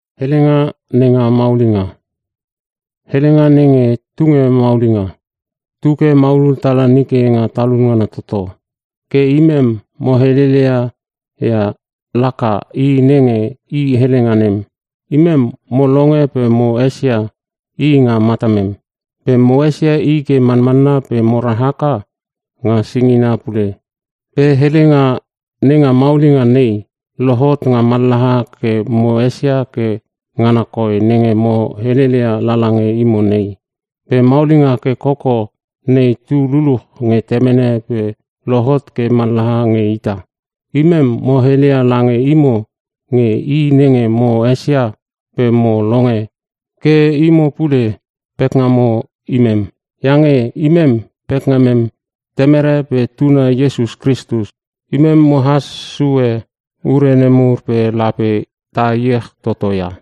Helenga nenge tunge maulinga, tuke maulul tala nike nga talun ngana toto. Ke imem mo helele ia laka I nenge I helenga nem. Imem mo longe pe mo esia I nga matamem. Pe mo esia I ke manmanna pe mora haka nga singina pule. Pe Helenga nenga maulinga nei, lohot nga mallaha ke mo esia ke ngana koi nenge mo heleia lala nge imo nei. Pe maulinga ke koko nei tu luluch nge Temene pe lohot ke mallaha nge ita. Imem mo hele lange imo nge I nenge mo esia pe mo longe ke imo pule pekngamo imem, iange imem pekngamem Temere pe Tuna Iesus Kristus. Imem mohas sue ure nemur pe lape ta iech toto ia.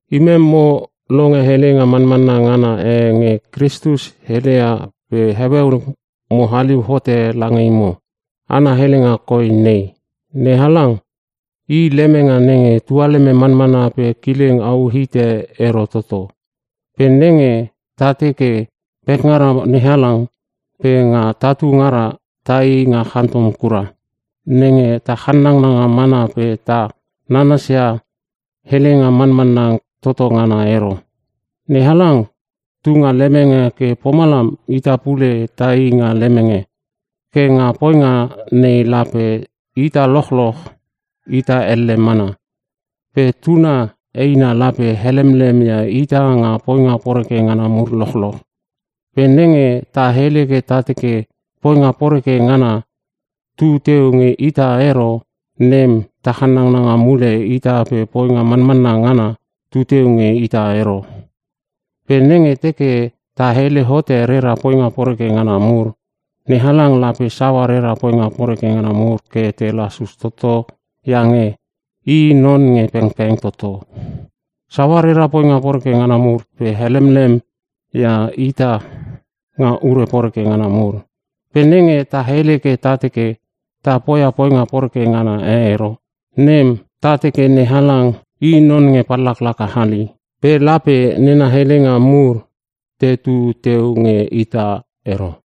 Imem mo longe helenga manmanna ngana e nge Kristus heleia pe heueu mo haliu hote lange imo. Ana helenga koi nei: NeHalang I lemenge nenge tualeme manmana pe kileng au hite I ero toto. Pe nenge ta teke pekngara NeHalang pe nga tatu ngara taii nga chantom kura, nem ta channanga mana pe ta nanas ia Helenga Manmanna Toto Ngana ero. NeHalang tunga lemenge ke pomalam ita pule tai nga lemenge. Ke nga poinga nei lape ita lochloch ita elle mana. Pe Tuna eina lape helemlem ia ita nga poinga poreke ngana mur lochloch. Pe nenge ta hele ke ta teke poinga poreke ngana e tu teu nge ita ero, nem ta channanga mule ita pe poinga manmanna ngana tu teu nge ita ero. Pe nenge teke ta hele hote rera poinga poreke ngana mur, NeHalang lape saua rera poinga poreke ngana mur ke te lasus toto iange I non nge pengpeng toto. Saua rera poinga poreke ngana mur pe helemlemia ita nga ure poreke ngana mur. Pe nenge ta hele ke ta teke ta poia poinga poreke ngana e ero, nem ta teke NeHalang i non nenge pallaka hali. Pe lape nena helenga mur tetu teu nge ita ero.